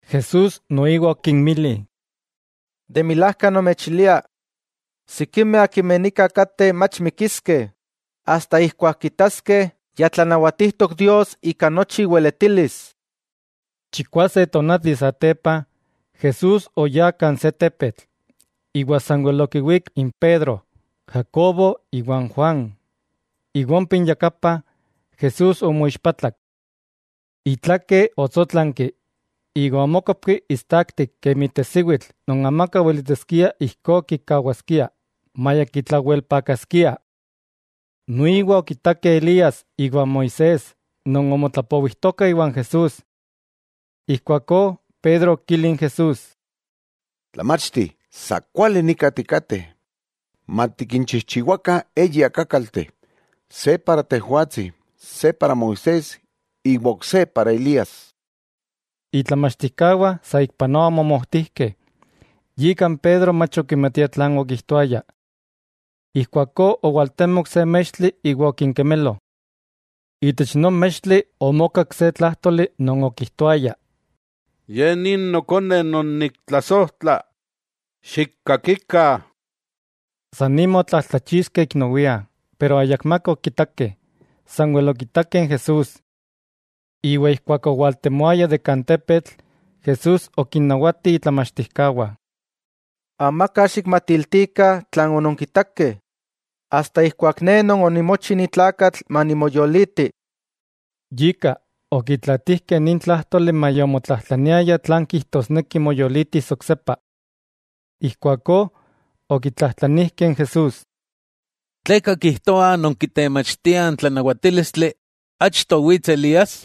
Jesús noiwa okinmili: —¡De milajka, nomechilia: sikimeh akimeh nika kateh mach mikiskeh asta ijkuak kitaskeh ya tlanawatijtok Dios ika nochi iweletilis! Chikwase tonati satepa, Jesús oyá kan se tepetl, iwa sanwel okinwík n Pedro, Jacobo iwa n Juan, iwa ompa inyakapa, Jesús omoixpatlak. Itlake otsótlanki iwa omókopki istaktik kemi tesiwitl non amaka weletiskia ijkó kikawaskia, maya kitlawelpakaskia. Noiwa okitakeh Elías iwan Moisés non omotlapowijtokah iwan Jesús. Ijkuakó Pedro okili n Jesús: —Tlamachti, sa kuali nika tikateh. Matikinchijchiwakah eyi akákalteh, se moaxka, se iaxka Moisés iwa ok se iaxka Elías. Itlamachtijkawah saikpanoa omomojtijkeh, yika n Pedro mach okimatia tlan okijtoaya. Ijkuakó owaltemok se mextli iwa okinkemelo. Itech non mextli omokak se tlájtoli non okijtoayah: —Ye ni Nokone non niktlasojtla, xikkakikah. San nima otlatlachixkeh ik nowia, iwa ayakmaka okitakeh, sanwel okitakeh n Jesús. Iwa ijkuak owaltemoayah ikpak tepetl, Jesús okinnawati itlamachtijkawah: —Amaka xikmatiltikah tlan ononkitakeh, asta ijkuak Ne Non onimochi ni tlakatl manimoyoliti. Yika, okitlaatijkeh nin tlájtoli maya omotlajtlaniayah tlan kijtosneki moyolitis oksepa. Ijkuakó, okitlajtlanijkeh n Jesús: —¿Tleka kijtoah non kitemachtiah n tlanawatílistli achto wits Elías?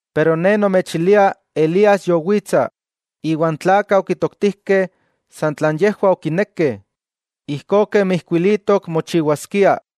Pero Ne nomechilia Elías yowitsa, iwa n tlakah okitoktijkeh san tlan yejwah okinekeh, ijkó kemi ijkuilitok mochiwaskia.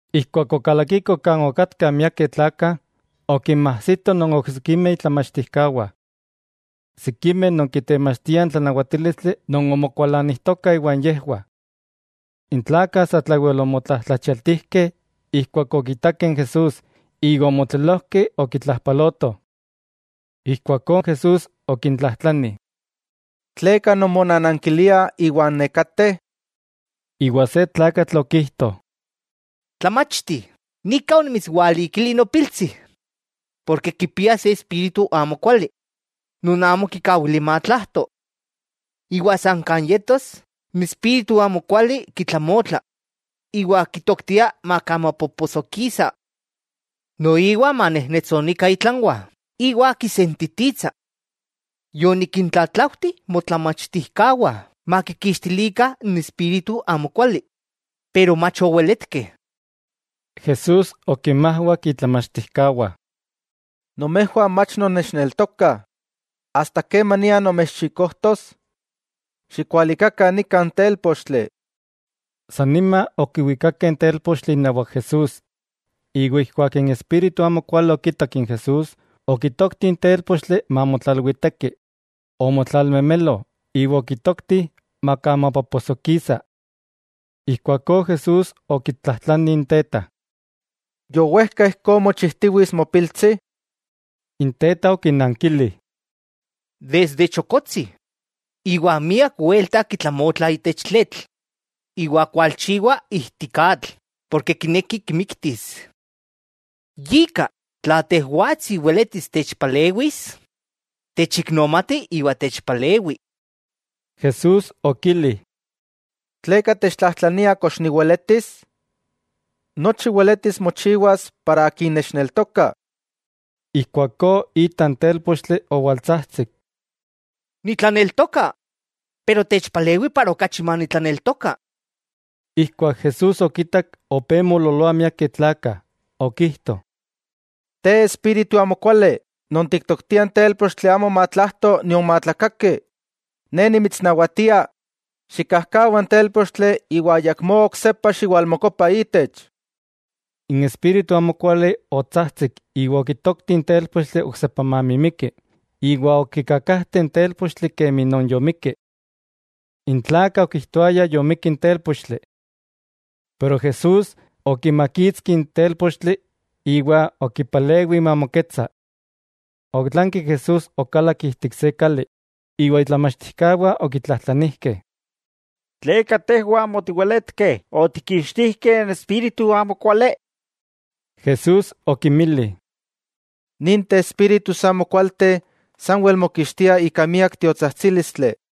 Ijkuak okalakikoh kan okatkah miakeh tlakah, okinmajsitoh non oksikimeh itlamachtijkawah. Sikimeh non kitemachtiah n tlanawatílistli non omokualanijtokah iwan yejwah. N tlakah satlawel omotlajtlachialtijkeh ijkuak okitakeh n Jesús iwa omotlelojkeh okitlajpalotoh. Ijkuakó Jesús okintlajtlani: —¿Tleka nonmonanankiliah iwa n nekateh? Iwa se tlakatl okijto: —Tlamachti, nika onimitswalikili nopiltsi, porke kipia se espíritu amokuali non amo kikawilia matlajto. Iwa san kan yetos, n espíritu amokuali kitlamotla, iwa kitoktia makamapoposojkisa. Noiwa manejnetsonikah itlanwah iwa kisentititsa. Yonikintlatlaujtih motlamachtijkawah makikixtilikah n espíritu amokuali pero mach oweletkeh. Jesús okinmajwak itlamachtijkawah: —¡Nomejwah mach nonnechneltokah! ¿Asta kemania nomechxikojtos? ¡Xikualikakah nika n télpochtli! San nima okiwikakeh n télpochtli inawak Jesús, iwa ijkuak n espíritu amokuali okitak n Jesús, okitokti n télpochtli mamotlalwiteki, omotlalmemelo iwa okitokti makamapoposojkisa. Ijkuakó Jesús okitlajtlani n teta: —¿Yowejka ijkó mochijtiwits mopiltsi? N teta okinankili: —Desde chokotsi. Iwa miak welta kitlamotla itech tletl iwa kualchiwa ijtik atl porke kineki kimiktis. Yika, tla Tejwatsi weletis techpalewis, techiknomati iwa techpalewi. Jesús okili: —¿Tleka techtlajtlania kox niweletis? Nochi weletis mochiwas para akin nechneltoka. Ijkuakó ita n télpochtli owaltsajtsik: —¡Nitlaneltoka, pero techpalewi para okachi manitlaneltoka! Ijkuak Jesús okitak opé moololoah miakeh tlakah, okijto: —Te espíritu amokuali non tiktoktia n télpochtli amo matlajto nion matlakaki, Ne nimitsnawatia xikkajkawa n télpochtli iwa ayakmó oksepa xiwalmokopa itech. N espíritu amokuali otsajtsik iwa okitokti n télpochtli oksepa mamimiki, iwa okikakajte n télpochtli kemi non yomikki. N tlakah okijtoayah yomikki n télpochtli. Pero Jesús, okimakitski n télpochtli iwa okipalewi mamoketsa. Otlanki Jesús okalak ijtik se kali, iwa itlamachtijkawah okitlajtlanijkeh. —¿Tleka tejwah amo otiweletkeh otikkixtijkeh n espíritu amokuali? Jesús okinmili: —Ninteh espíritus amokualteh sanwel mokixtia ika miak tiotsajtsílistli.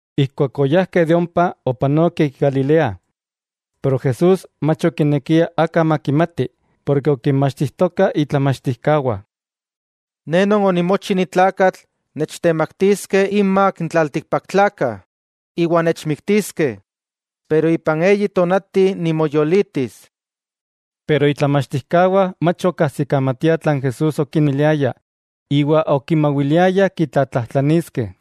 Ijkuak oyajkeh de ompa, opanokeh ik Galilea. Pero Jesús mach okinekia aka makimati, porke okinmachtijtoka itlamachtijkawah: —Ne Non onimochi ni tlakatl nechtemaktiskeh inmak n tlaltikpaktlakah, iwa nechmiktiskeh, pero ipan eyi tonati nimoyolitis. Pero itlamachtijkawah mach okajsikamatiah tlan Jesús okinmiliaya, iwa okimawiliayah kitlatlajtlaniskeh.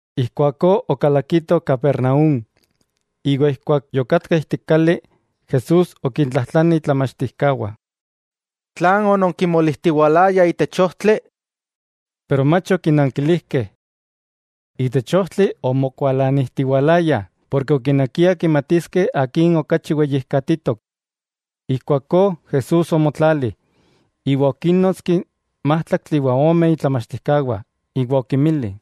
Ijkuakó okalakitoh Capernaúm, iwa ijkuak yokatkah ijtik kali, Jesús okintlajtlani itlamachtijkawah: —¿Tlan ononkimolijtiwalayah itech ojtli? Pero mach okinankilijkeh. Itech ojtli omokualanijtiwalayah porke okinekiah kimatiskeh akin okachi weyijkatitok. Ijkuakó Jesús omotlali, iwa okínnotski n májtlaktli iwa ome itlamachtijkawah, iwa okinmili: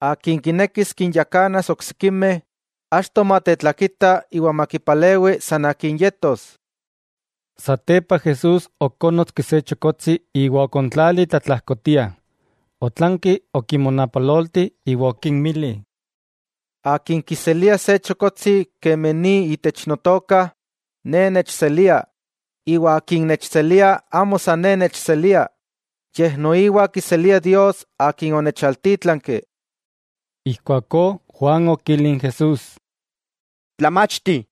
—Akin kinekis kinyakanas oksikimeh, achto matetlakita iwa makipalewi san akin yetos. Satepa Jesús okónnotski se chokotsi iwa okontlali tlatlajkotia, otlanki okimonapalolti iwa okinmili: —Akin kiselia se chokotsi kemi ni itech Notoka, Ne nechselia, iwa akin nechselia amo san Ne nechselia, yej noiwa kiselia Dios Akin onechaltítlanki. Ijkuakó Juan okili n Jesús: —Tlamachti,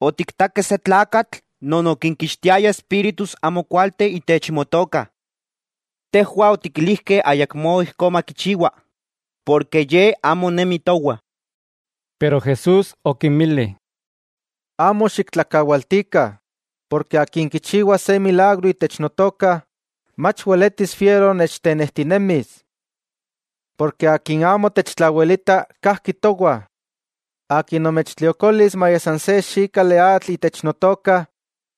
otiktakeh se tlakatl non okinkixtiaya espíritus amokualteh itech Motoka. Tejwah otikilijkeh ayakmó ijkó makichiwa, porke ye amo nemi towah. Pero Jesús okinmili: —Amo xiktlakawaltikah, porke akin kichiwa se milagro itech Notoka, mach weletis fiero nechtenejtinemis. Porke akin amo techtlawelita, kajki towah. Akin nomechtliokolis maya san se xikali atl itech Notoka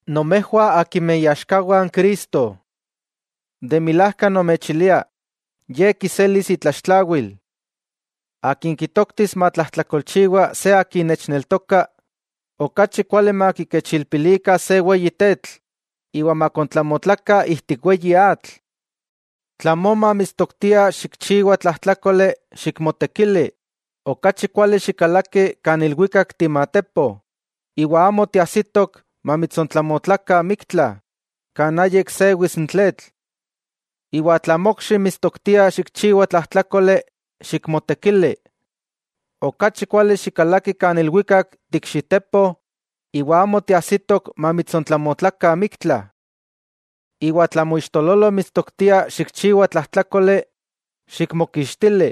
nomejwah akimeh iaxkawah n Cristo. De milajka nomechilia ye kiselis itlaxtlawil. 'Akin kitoktis matlajtlakolchiwa se akin nechneltoka, okachi kuali makikechilpilikah se weyi tetl iwa makontlamotlakah ijtik weyi atl. Tla moma mitstoktia xikchiwa tlajtlákoli, xikmotekili, okachi kuali xikalaki kan ilwikak timatepo, iwa amo tiajsitok mamitsontlamotlakah miktla, kan ayik sewis n tletl. 'Iwa tla mokxi mitstoktia xikchiwa tlajtlákoli, xikmotekili. Okachi kuali xikalaki kan ilwikak ti ikxitepo iwa amo tiajsitok mamitsontlamotlakah miktla. 'Iwa tla moixtololo mitstoktia xikchiwa tlajtlákoli, xikmokixtili.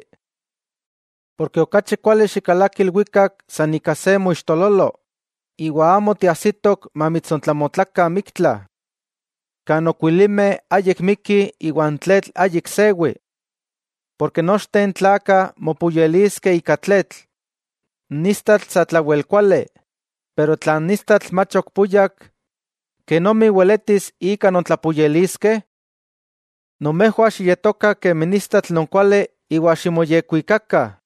Porke okachi kuali xikalaki ilwikak san ika se moixtololo, iwa amo tiajsitok mamitsontlamotlakah miktla, kan okuilimeh ayik mikkih iwa n tletl ayik sewi. 'Porke nochteh n tlakah mopuyeliskeh ika tletl. N istatl satlawel kuali, pero tla n istatl mach ok puyak, ¿kenomi weletis ika nontlapuyeliskeh? Nomejwah xiyetokah kemi n istatl non kuali iwa ximoyekwikakah.